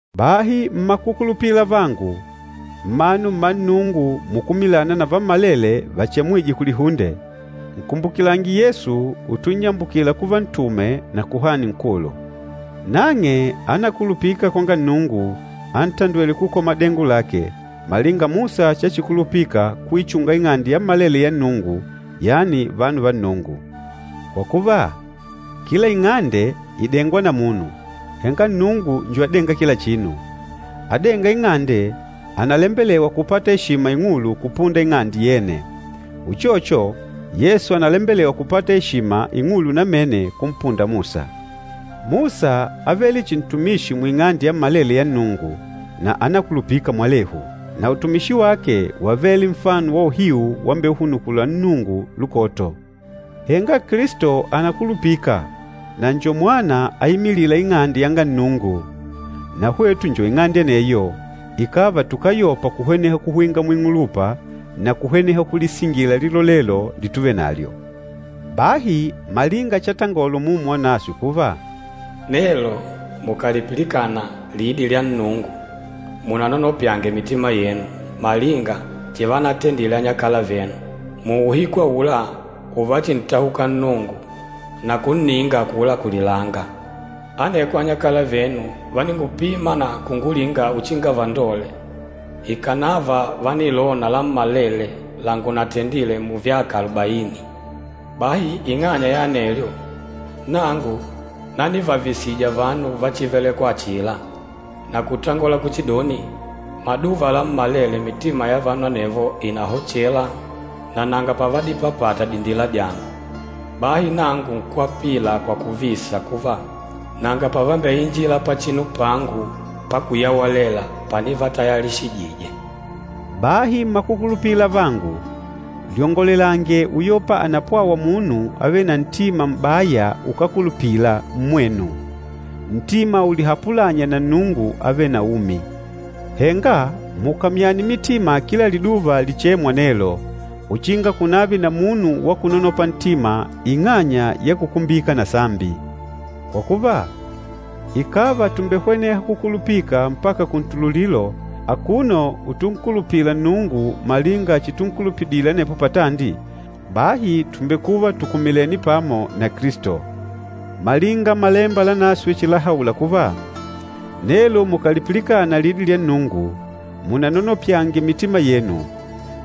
Bahi mmakukulupila avangu, mmanu mma Nnungu mukumilâna na vammalele vachemwîje kulihunde, nkumbukilange Yesu utunnyambukila kuva Ntume na Kuhani Nkulu. Nang'e ánakulupika kwanga Nnungu, antandwêle kukola madengo lake, malinga Musa chachikulupika kuichunga ing'ande yammalele ya Nnungu, yani vanu va Nnungu. Kwa kuva, kila ing'ande ìdengwa na munu, henga Nnungu njo adênga kila chinu. Adênga ing'ande ànalembelewa kupata eshima ing'ulu kupunda ing'ande yene. Uchocho, Yesu ànalembelewa kupata eshima ing'ulu namene kumpunda Musa. Musa ávele chihi ntumishi muing'ande yammalele ya Nnungu na ánakulupika mwalehu. Na utumishi wake wávele nfano wa uhiu wambeuhunukula Nnungu lukoto. Henga Kilisto ànakulupika, na njo Mwana aimilîla ing'ande yanga Nnungu. Na hwetu njo ing'ande aneyo, ikàva tukáyopa kuhweneha kuhwinga muing'ulupa na kuhweneha kulisingila lilolelo lituvenalyo. Bahi malinga chatangola Umumu Wanaswe kuva, “Nelo mukàlipilikana lidi lya Nnungu, munanonopyange mitima yenu, malinga chivanatendile anyakala venu, muuhiku aula uvachintahuka Nnungu, na kunninga akula kulilanga. Aneko anyakala venu váningupima na kungulinga uchinga vandole, Ikànava vánilona lammalele langunatendile muvyaka alubaini. Bahi ing'anya ya anelyo, nangu nanivavisija vanu va chívelèkwà achila, na kutangola kuchidoni, ‘Maduva lammalele mitima ya vanu anevo ìnahochela, na nanga pavadipapata dindila dyangu.’ Bahi nangu nkwapila kwa kuvisa kuva, ‘Nanga pavambeinjila pachinu pangu pakuyewelela panivatayalishijije!’” Bahi mmakukulupila avangu, lyongolelange uyopa ànapwawa munu avêle na ntima m'baya ukákulupila mmwenu, ntima ulihapulânya na Nnungu avêle na umi. Henga mukamyane mitima kila liduva lichêmwa nelo, uchinga kunave na munu wa kunonopa ntima ing'anya ya kukumbika na sambi. Kwa kuva, ikàva tùmbehweneha kukulupika mpaka kuntululilo akuno utunkulupila Nnungu malinga chitunkulupidile anepo patandi, bahi tùmbekuva tukumilènè pamo na Kilisto. Malinga Malemba Lanaswe chilahaula kuva, “Nelo mukàlipilikana lidi lya Nnungu, munanonopyange mitima yenu,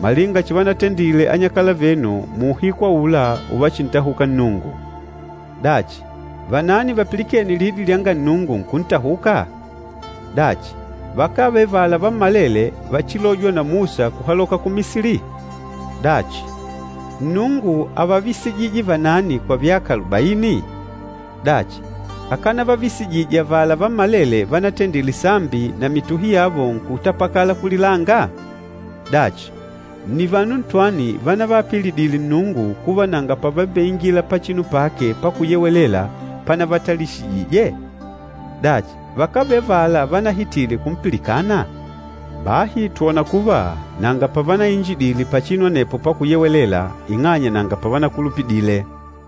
malinga chivanatendile anyakala venu muuhiku aula uvachintahuka Nnungu.” Dachi, vanani vapilikêne lidi lyanga Nnungu nkuntahuka? Dachi, vakávele avala vammalele vachilôjwa na Musa kuhaloka ku Misili? Dachi, Nnungu ávavisijije vanani kwa vyaka alubaini? Dachi, akánavavisijije avala vammalele vanatendile sambi, na mituhi yavo nkutapakala kulilanga? Dachi, nni vanu ntwani vanavaapilidile Nnungu kuva nanga pavambeingila pachinu pake pakuyewelela panavatayalishijije? Dachi, vakávele avala vanahitile kumpilikana? Bahi twòna kuva nanga pavanainjidile pachinu anepo pakuyewelela ing'anya nanga pavanakulupidile.